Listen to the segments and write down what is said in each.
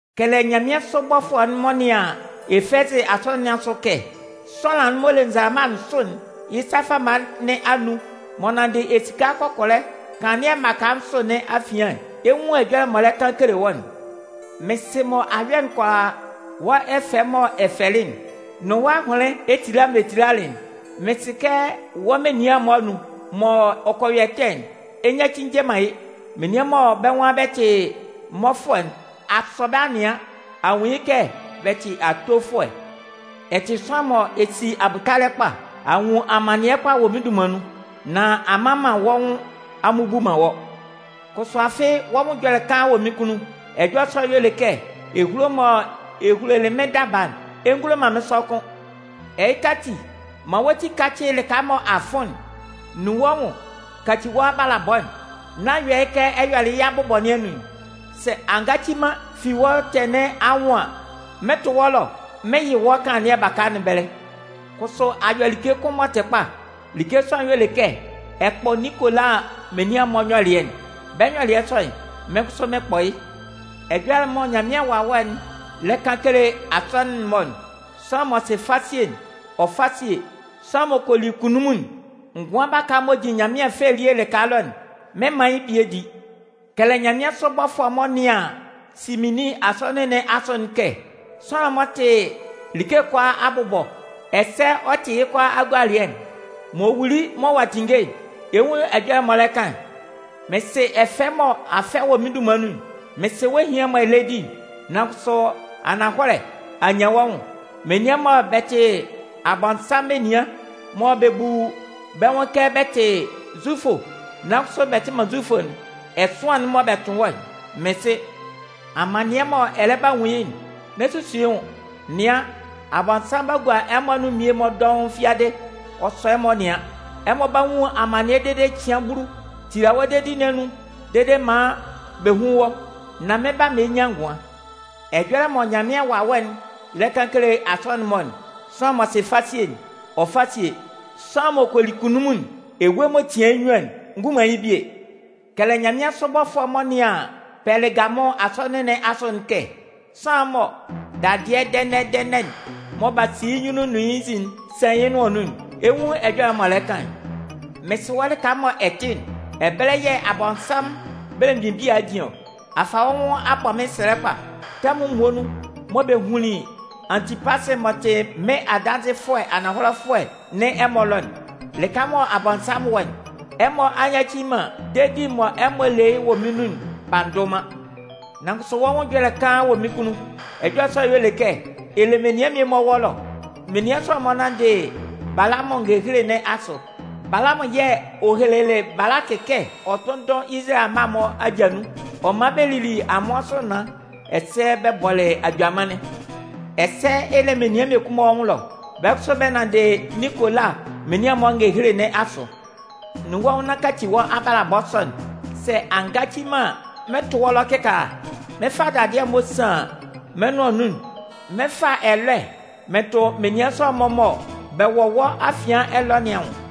Kɛlɛ nyanmɩansʋ bɔfʋɛ'n m'ɔ nɩan Efɛzɩ Asɔnɩn nɩn asʋ'n kɛ: Sʋanlan'n m'ɔ le nzalama nsʋ'n yɩ́ sa fama nɩn anun, m'ɔ nanndɩ esika kɔkɔlɛ kanlannɩɛ mmaka nsʋ nɩn afian'n, ɛ 'nwun ɛjɔlɛ m'ɔ lɛ kan kele wɔ́'n: Mɩn sɩ mɔ a yɔ'n kʋalaa, wɔ́ ɛfɛ'n m'ɔ ɛ fɛlɩ'n, nʋn wɔ́ ahʋnlɩn etila'n mɔ ɛ tilalɩ'n. Mɩn sɩ kɛ wɔ́ menian'n-mɔ anun, mɔ ɔ kɔ yɔ ɛtɛ'n, ɛ nyaci nje man yɩ́. Menian mɔ bɛ́ nwan bɛ tɩ mmɔfʋɛ'n, a sɔ bɛ́ a nɩan, a nwun yɩ́ kɛ bɛ tɩ atofʋɛ. Ɛ tɩ sʋanlan mɔ ɛ si abʋtalɛ kpa, a nwun amannɩɛ kpa wɔ mɩ́n dunman nun, nan a mman man wɔ́ nwʋn a mmubu man wɔ́. Kʋsʋ afɩ wɔ́ nwʋn ɛjɔlɛ kaan wɔ mɩ́n kunnun. Ɛjɔlɛ sɔ'n y'ɔ le kɛ ehulo'n mɔ ɛ hulolɩ mɩ́n daba'n, ɛ ngulo man mɩ́n sɔ kʋ́n. Ɛhɩka ati, man wɔ́ ti kácɩ lɩka mɔ a fʋn'n. Nun wɔ́ nwʋn kaci wɔ́ abalabɔ'n, nán yɔ yɩ́ kɛ ɛ yɔlɩ yɩ́ abʋbɔ nɩn anun'n. Sɛ a ngaci man fi wɔ́ ɛtɛ nɩn anwʋn an, mɩn 'tʋ wɔ́ ɛlɔ, mɩn 'yɩ wɔ́ kanlannɩɛ baka nɩn ɛbɛlɛ. Kʋsʋ a yɔ like kʋn m'ɔ tɩ kpa. Like sɔ'n y'ɔ le kɛ ɛ kpɔ Ninkola menian'n-mɔ nyɔlɩɛ'n. Bɛ́ nyɔlɩɛ sɔ'n, mɩ́n kʋsʋ mɩn kpɔ yɩ́. Ɛjɔlɛ'n mɔ Nyanmɩan Wawɛ'n lɛ kan kele Asɔnɩn'n-mɔ'n, sʋanlan m'ɔ sɩ fasie'n, ɔ fá síe! Sʋanlan m'ɔ kɔ li kunnunmun'n, ngʋan baka'n m'ɔ jin Nyanmɩan fɛ elie lɩka ɛlɔ'n, mɩn 'man yɩ́ bie di. Kɛlɛ nyanmɩansʋ bɔfʋɛ'n m'ɔ nɩan Sɩminnin Asɔnɩn nɩn asʋ'n kɛ: Sʋanlan'n m'ɔ tɩ like kʋalaa abʋbɔ, ɛsɛ ɔ tɩ yɩ́ kʋalaa agualɩɛ'n, m'ɔ wuli mɔ ɔ'a tinnge'n, ɛ 'nwun ɛjɔlɛ m'ɔ lɛ kan'n: Mɩn sɩ ɛfɛ mɔ a fɛ wɔ mɩ́n dunman nun'n, mɩn sɩ wɔ́ ehian'n mɔ ɛ lɛ di'n. Nan kʋsʋ, ananhɔlɛ a nyan wɔ́ nwʋn. Menian mɔ bɛ tɩ Abɔnsanmʋn menian, mɔ bɛ bu bɛ́ nwʋn kɛ bɛ tɩ Zufʋ nan kʋsʋ bɛ tɩ man Zufʋ'n, ɛsʋan'n mɔ bɛ tʋn wɔ́'n, mɩn sɩ. Amannɩɛ'n mɔ ɛ lɛ ba nwun yɩ́'n, n'ɛ susu yɩ́ nwʋn. Nɩan, Abɔnsanmʋn 'ba gua ɛmɔ anun mmie-mɔ dɔʋn fiadɩ ɔ sɔ ɛmɔ nɩan. Ɛmɔ 'ba nwun amannɩɛ dede cɩan bulu. Tila wɔ́ dedi nɩn anun dede maan bɛ hún wɔ́, nan mɩn 'ba man ɛ nyan ngʋan. Ɛjɔlɛ mɔ Nyanmɩan Wawɛ'n lɛ kan kele Asɔnɩn'n-mɔ'n, sʋanlan m'ɔ sɩ fasie'n, ɔ fá síe! Sʋanlan m'ɔ kɔ li kunnunmun'n, ewue'n m'ɔ tian yɩ́ nnyuan'n ngun man yɩ́ bie. Kɛlɛ nyanmɩansʋ bɔfʋɛ'n m'ɔ nɩan Pɛlɩgamʋn Asɔnɩn nɩn asʋ'n kɛ: Sʋanlan'n mɔ dadɩɛ dɛnɛ-dɛnɛ'n mɔ b'a si yɩ́ nyunnun nʋn yɩ́ nzin'n san yɩ́ nʋan nun'n, ɛ 'nwun ɛjɔlɛ m'ɔ lɛ kan'n: Mɩn sɩ wɔ́ lɩka mɔ ɛ tɩ'n, ɛbɛlɛ yɛ̂ Abɔnsanmʋn belemgbin bia'n jin ɔ. A fa wɔ́ nwʋn a bɔ mɩ́n sɛlɛ kpa. Tɛmʋn muonun mɔ bɛ hunlin Antipasɩ m'ɔ tɩ mɩ́n adanzɩfʋɛ ananhɔlɛfʋɛ nɩn ɛmɔ ɛlɔ'n, lɩka mɔ Abɔnsanmʋn wɔ'n, ɛmɔ a nyaci man dedi'n mɔ ɛmɔ le yɩ́ wɔ mɩ́n nun'n b'a ndʋ man. Nan kʋsʋ wɔ́ nwʋn ɛjɔlɛ kaan wɔ mɩ́n kunnun. Ɛjɔlɛ sɔ'n y'ɔ le kɛ: Ɛ le menian mmie-mɔ wɔ́ ɛlɔ. Menian sɔ'n-mɔ nanndɩ Balamʋn ngehele nɩn asʋ. Balamʋn yɛ̂ ɔ helelɩ Balakɩ kɛ ɔ tʋ́nndʋn Izalayɛ amma'n-mɔ aja nun, ɔ man bɛ lili amʋan sʋ naan, ɛsɛ bɛ bɔlɩ ajʋamannɩn. Ɛsɛ ɛ le menian mmiekun-mɔ wɔ́ nwʋn ɛlɔ. Bɛ́ kʋsʋ bɛ nanndɩ Ninkola menian'n-mɔ ngehele nɩn asʋ. Nun wɔ́ nwʋn nán kaci wɔ́ abalabɔ sɔ'n. Sɛ a ngaci man an, mɩn 'tʋ wɔ́ ɛlɔ kɩkaala, mɩn 'fa dadɩɛ'n m'ɔ san mɩ́n nʋan nun'n mɩn fa ɛlɔɛ mɩn tʋ menian sɔ'n-mɔ mɔ bɛ wɔ wɔ́ afian ɛlɔ nɩn anwʋn.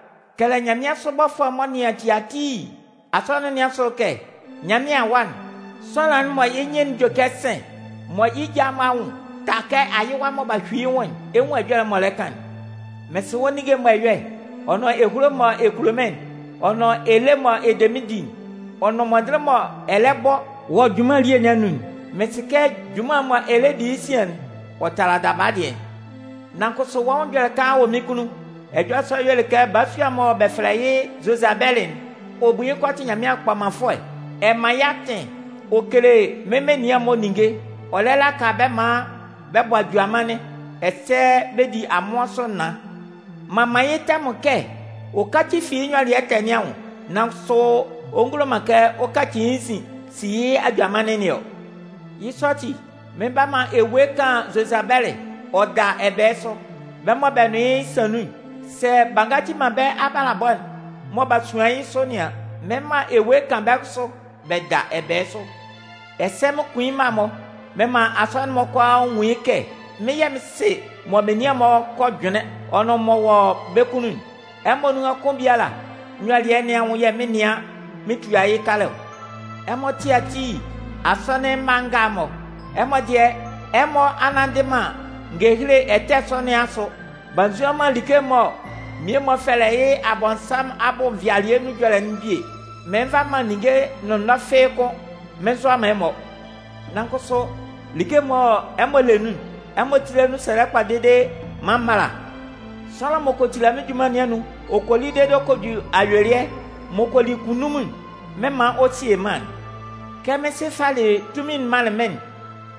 Kɛlɛ nyanmɩansʋ bɔfʋɛ'n m'ɔ nɩan Tiatii Asɔnɩn nɩn asʋ'n kɛ: Nyanmɩan Awa'n, sʋanlan'n mɔ yɩ́ nyɩn'n jue kɛ sɩ̂n, mɔ yɩ́ ja'n-mɔ anwʋn ta kɛ ayɩwa mɔ b'a hyui yɩ́ nwʋn'n, ɛ 'nwun ɛjɔlɛ m'ɔ lɛ kan'n: Mɩn sɩ wɔ́ ninnge'n mɔ ɛ yɔ'n, ɔ nʋn ehulo'n mɔ ɛ kulo mɩ́n'n, ɔ nʋn ele'n mɔ ɛ de mɩ́n di'n, ɔ nʋn mɔndɩnlɩn'n mɔ ɛ lɛ bɔ wɔ junman elie nɩn anun'n. Mɩn sɩ kɛ junman'n mɔ ɛ lɛ di yɩ́ sian'n, ɔ tala daba dɩɛ'n. Nan kʋsʋ wɔ́ nwʋn ɛjɔlɛ kaan wɔ mɩ́n kunnun. Ɛjɔlɛ sɔ'n y'ɔ le kɛ balasua'n mɔ bɛ fɛlɛ yɩ́ Zozabɛlɩ'n, ɔ bu yɩ́ nwʋn kɛ ɔ tɩ Nyanmɩan kpɔmanfʋɛ. Ɛ man yɩ́ atɩn, ɔ kele mɩ́n menian'n-mɔ ninnge, ɔ lɛ laka bɛ́ maan bɛ bɔ ajʋamannɩn ɛsɛ bɛ di amʋan sʋ naan. M'an man yɩ́ tɛmʋn kɛ ɔ káci fi yɩ́ nyɔlɩɛ ɛtɛ nɩn anwʋn, nan kʋsʋ ɔ ngulo man kɛ ɔ kaci yɩ́ nzin si yɩ́ ajʋamannɩn nɩn ɔ. Yɩ́ sɔ ati, mɩn 'ba man ewue kan Zozabɛlɩ ɔ da ɛbɛɛ sʋ. Bɛ́ mɔ bɛ nʋn yɩ́ san nun'n, sɛ b'a ngaci man bɛ́ abalabɔ'n mɔ b'a suan yɩ́ sʋ nɩn an, mɩn 'man ewue kan bɛ́ kʋsʋ bɛ da ɛbɛɛ sʋ. Ɛsɛ mɩn 'kun yɩ́ mma'n-mɔ, mɩn 'man Asɔnɩn'n-mɔ kʋalaa nwun yɩ́ kɛ mɩ́n yɛ̂ mɩn sɩ mɔ menian'n-mɔ kɔ jʋnlɩn, ɔ nʋn m'ɔ wɔ bɛ́ kunnun'n. Ɛmɔ nunhan kʋn biala nyɔlɩɛ nɩn anwʋn yɛ̂ mɩn 'nɩan mɩn tua yɩ́ kalɛ ɔ. Ɛmɔ Tiatii asɔnɩn mma nga'n-mɔ, ɛmɔ dɩɛ, ɛmɔ a nnanndɩ man ngehele ɛtɛ sɔ nɩn asʋ b'a nzuan man like'n mɔ mmie-mɔ fɛlɛ yɩ́ Abɔnsanmʋn abʋ nvɩalɩɛ nun ɛjɔlɛ'n bie. Mɩɩn nva man ninnge nʋnnɔɛ fɩ́ɩ́ kʋ́n mɩn nzʋa man ɛmɔ. Nan kʋsʋ, like'n mɔ ɛmɔ le nun'n, ɛmɔ tíla nun sɛlɛ kpa dede maan m mála. Sʋanlan m'ɔ kɔ tila mɩ́n junman nɩn anun, ɔ kɔ li dede ɔ kɔ ju ayuelɩɛ, m'ɔ kɔ li kunnunmun'n, mɩn 'man ɔ sie mân'n. Kɛ mɩ́n Sɩ falɩ tunmin'n manlɩn mɩ́n'n,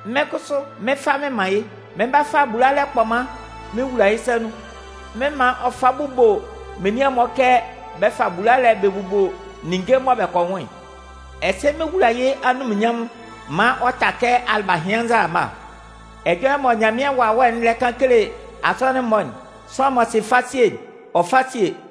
mɩ́n kʋsʋ mɩn 'fa mɩn man yɩ́. Mɩn 'ba fa bulalɛ kpɔman mɩn wula yɩ́ sa nun, mɩn 'man ɔ fa bubo menian'n-mɔ kɛ bɛ fa bulalɛ'n bɛ bubo ninnge mɔ bɛ kɔ nwʋn'n. Ɛsɛ mɩn 'wula yɩ́ anunminnyanmʋn maan ɔ ta kɛ alɩbahɩan nzalama. Ɛjɔlɛ mɔ Nyanmɩan Wawɛ'n lɛ kan kele Asɔnɩn'n-mɔ'n, sʋanlan m'ɔ sɩ fasie'n, ɔ fá síe!